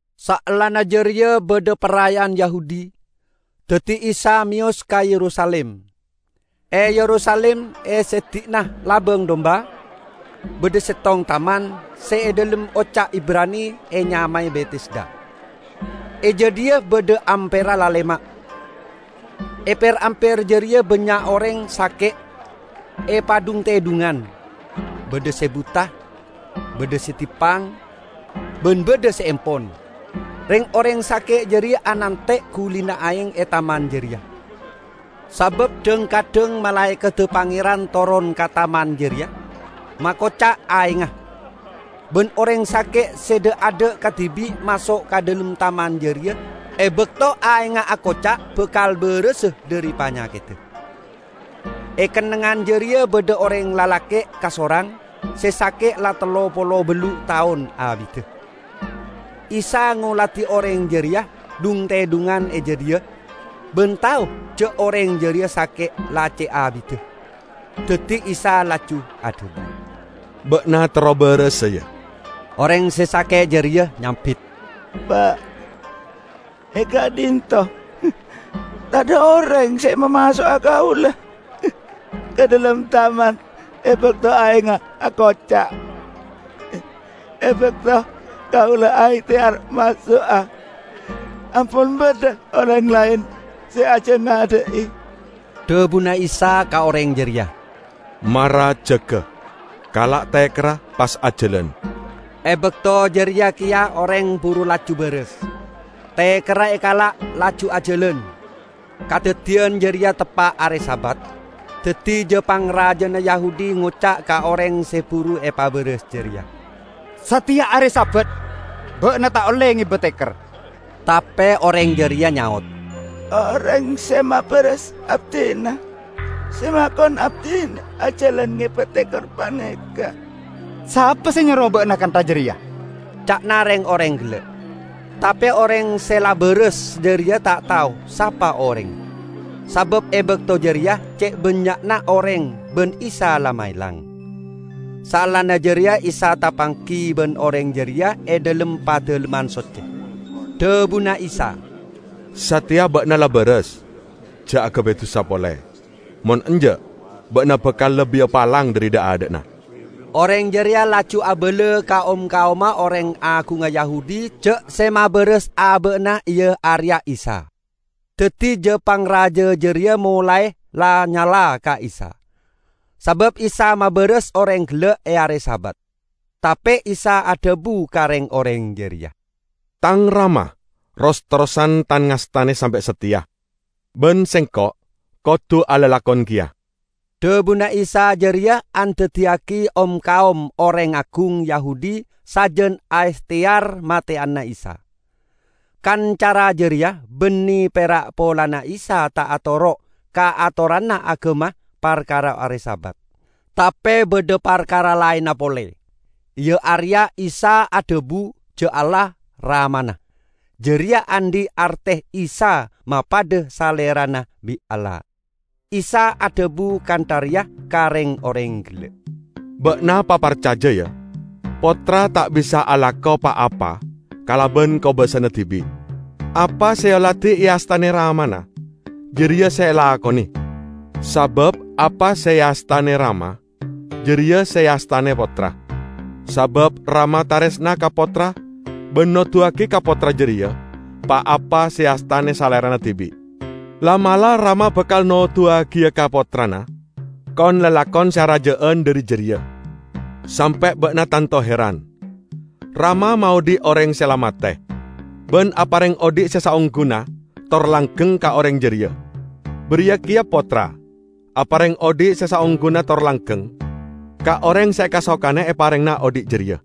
Saellana jareya badha paraya'an Yahudi, daddi Isa meyos ka Yerusalim. E Yerusalim, e seddi'na "Labang Dumba" badha settong taman, se e dhalem oca' Ibrani enyamae Betesda. E jadhiya badha amperra lalema'. E per-amper jareya bannya' oreng sake' epadhung-tedhungan; badha se buta, badha se dippang, ban badha se empon. (Reng-oreng sake' jareya anante' gulina aeng e taman jareya. Sabab dhang-kadhang malaekadda Pangeran toron ka taman jareya, makocak aengnga. Ban oreng sake' se dha'-adha' kadibi' maso' ka dhalem taman jareya e bakto aengnga akocak bakal barasa dhari panyakedda.) E kennengngan jareya badha oreng lalake' kasorang se sake' la tello polo ballu' taon abidda. Isa ngoladi oreng jareya dhung-tedhungan e jadhiya, ban tao ja' oreng jareya sake' la ce' abidda. Daddi Isa laju adhabu, "Ba'na terro barasa, ya?" Oreng se sake' jareya nyambit, "Pa', e ka'dhinto' tadha' oreng se mamaso'a kaula ka dhalem taman e bakto aengnga akocak. E bakto kaula aehteyar maso'a, ampon badha oreng laen se ajangadha'i." Dhabuna Isa ka oreng jareya, "Mara jaga, kala' tekerra, pas ajalan." E bakto jareya keya oreng buru laju baras. Tekerra ekala', laju ajalan. Kadaddiyan jareya teppa' are Sabat. Daddi ja-pangrajana Yahudi ngoca' ka oreng se buru epabaras jareya, "Sateya are Sabat. Ba'na ta' olle ngeba teker." Tape oreng jareya nyaot, "Oreng se mabaras abdina se makon abdina ajalan ngeba teker paneka." "Sapa se nyoro ba'na kantha jareya?" ca'na reng-oreng gella'. Tape oreng se la baras jareya ta' tao sapa orengnga, sabab e bakto jareya ce' bannya'na oreng ban Isa la maelang. Saellana jareya Isa tapanggi ban oreng jareya e dhalem Padalemman Socce. Dhabuna Isa, "Sateya ba'na la baras. Ja' agabay dusa pole, mon enja' ba'na bakal lebbiya palang dhari dha'-adha'na." Oreng jareya laju abala ka om-kaom oreng agungnga Yahudi ja' se mabaras aba'na iya areya Isa. Daddi ja-pangraja jareya molae la-nyala ka Isa, sabab Isa mabaras oreng gella' e are Sabat. Tape Isa adhabu ka reng-oreng jareya, "Tang Rama ros-terrosan tan-ngastane sampe' sateya, ban Sengko' kodu alalakon keya." Dhabuna Isa jareya andaddiyagi om-kaom oreng agung Yahudi sajan aehteyar mateyana Isa. Kan cara jareya, banne pera' polana Isa ta' atoro' ka atoranna agama parkara are Sabat, tape badha parkara laenna pole, iya areya Isa adhabu ja' Allah Ramana; jareya andhi' arte Isa mapadha Salerana bi' Allah. Isa adhabu kantha reya ka reng-oreng gella', "Ba'na paparcaja, ya; Pottra ta' bisa alako pa-apa kalaban kobasana dibi'. Apa se eoladi eastane Ramana, jareya se elakone. Sabab apa se eastane Rama, jareya se eastane Pottra. Sabab Rama taresna ka Pottra ban noduwagi ka Pottra jareya pa-apa se eastane Salerana dibi'. La'-mala' Rama bakal noduwagiya ka Pottrana kon-lalakon se araja'an dhari jareya, sampe' ba'na tanto heran. Rama maodhi' oreng se la mate, ban apareng odhi' se saongguna tor langgeng ka oreng jareya; bariya keya Pottra apareng odhi' se saongguna tor langgeng ka oreng se ekasokane eparengngana odhi' jareya.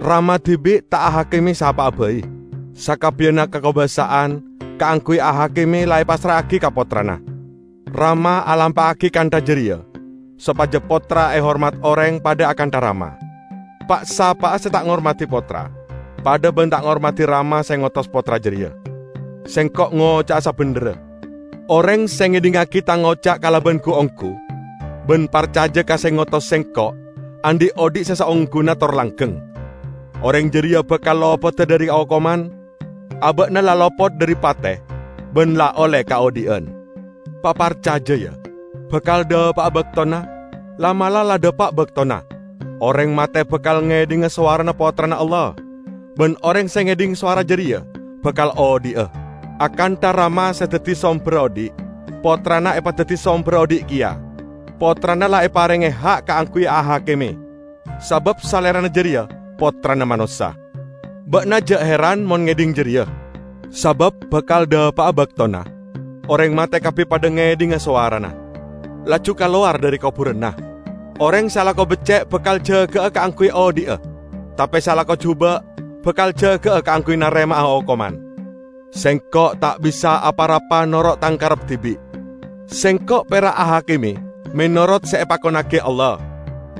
Rama dibi' ta' ahakime sapa'a bai. Sakabbiyanna kakobasa'an kaangguy ahakime la epassra'agi ka Pottrana. Rama alampa'agi kantha jareya sopaja Pottra ehormat oreng padha akantha Rama. Pa'-sapa'a se ta' ngormadi Pottra padha ban ta' ngormadi Rama se ngotos Pottra jareya. Sengko' ngoca'a sabendherra: Oreng se ngedhingngagi Tang oca' kalaban gu-onggu, ban parcaja ka se ngotos Sengko', andhi' odhi' se saongguna tor langgeng. Oreng jareya bakal lopoda dhari okoman; aba'na la lopot dhari pate ban la olle kaodhi'an. Paparcaja, ya: Bakal dhapa'a baktona, la'-mala' la dhapa' baktona, oreng mate bakal ngedhinga sowarana Pottrana Allah, ban oreng se ngedhing sowara jareya bakal odhi'a. Akantha Rama se daddi somberra odhi', Pottrana epadaddi somberra odhi' keya. Pottrana la eparenge ha' kaangguy ahakime, sabab Salerana jareya Pottrana Manossa. Ba'na ja' heran mon ngedhing jareya; sabab bakal dhapa'a baktona oreng mate kabbi padha ngedhinga sowarana, laju kalowar dhari koburanna. Oreng se alako becce' bakal jaga'a kaangguy odhi'a, tape se alako juba' bakal jaga'a kaangguy narema'a okoman." "Sengko' ta' bisa apa-rapa noro' Tang karep dibi'. Sengko' pera' ahakime menorot se epakonnagi Allah.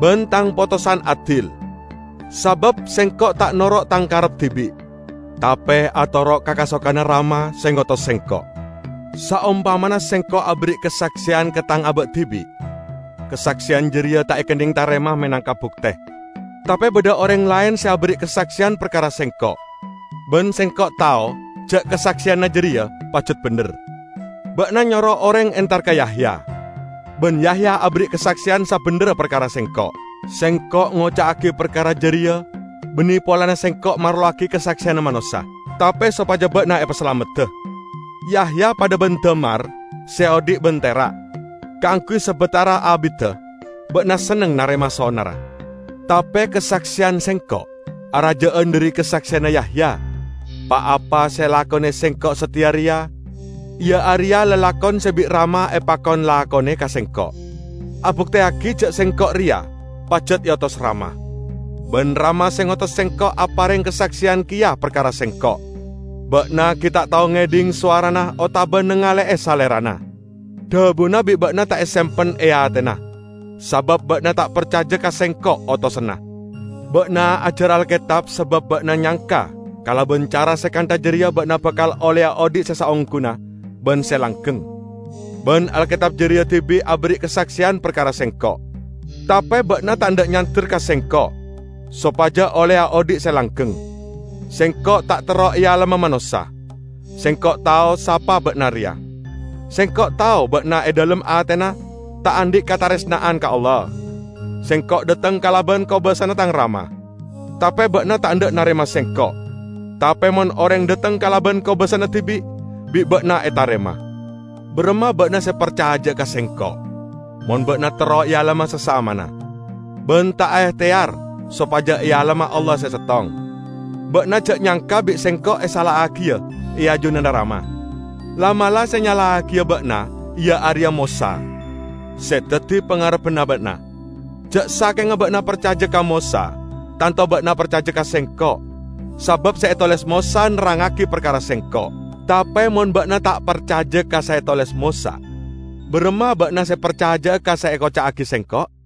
Ban tang potosan adil, sabab Sengko' ta' noro' Tang karep dibi', tape atoro' ka kasokanna Rama se ngotos Sengko'. Saompamana Sengko' aberri' kasakseyan ka Tang aba' dibi', kasakseyan jareya ta' ekenneng tarema menangka bukte. Tape badha oreng laen se aberri' kasakseyan parkara Sengko', ban Sengko' tao ja' kasakseyanna jareya pajat bendher. Ba'na nyoro oreng entar ka Yahya, ban Yahya aberri' kasakseyan sabendherra parkara Sengko'. Sengko' ngoca'agi parkara jareya banne polana Sengko' marlowagi kasakseyanna manossa, tape sopaja ba'na epasalamedda. Yahya padha ban damar se odhi' ban tera'. Kaangguy sabatara abidda ba'na senneng narema sonarra. Tape kasakseyan Sengko' araja'an dhari kasakseyanna Yahya. Pa-apa se elakone Sengko' sateya reya, iya areya lalakon se bi' Rama epakon lakone ka Sengko', abukteyagi ja' Sengko' reya pajat eotos Rama. Ban Rama se ngotos Sengko' apareng kasakseyan keya parkara Sengko'. Ba'na gi' ta' tao ngedhing sowarana otaba nangale'e Salerana. Dhabuna bi' ba'na ta' esempen e atena sabab ba'na ta' parcaja ka Sengko' otosanna. Ba'na ajar Alketab sabab ba'na nyangka kalaban cara se kantha jareya ba'na bakal olleya odhi' se saongguna ban se langgeng. Ban Alketab jareya dibi' aberri' kasakseyan parkara Sengko'. Tape ba'na ta' endha' nyander ka Sengko' sopaja olleya odhi' se langgeng. Sengko' ta' terro ealemma manossa. Sengko' tao sapa ba'na reya. Sengko' tao ba'na e dhalem atena ta' andhi' kataresna'an ka Allah. Sengko' dhateng kalaban kobasana Tang Rama, tape ba'na ta' endha' narema Sengko'. Tape mon oreng dhateng kalaban kobasana dibi' bi' ba'na etarema. Baramma ba'na se parcaja'a ka Sengko', mon ba'na terro ealemma sasamana, ban ta' aehteyar sopaja ealemma Allah Se Settong? Ba'na ja' nyangka bi' Sengko' esala'agiya e ajunanna Rama. La'-mala' se nyala'agiya ba'na iya areya Mosa, se daddi pangarebbanna ba'na. Ja' sakenga ba'na parcaja ka Mosa tanto ba'na parcaja ka Sengko', sabab se etoles Mosa nerrangngagi parkara Sengko'. Tape mon ba'na ta' parcaja ka se etoles Mosa, baramma ba'na se parcaja'a ka se ekoca'agi Sengko'?"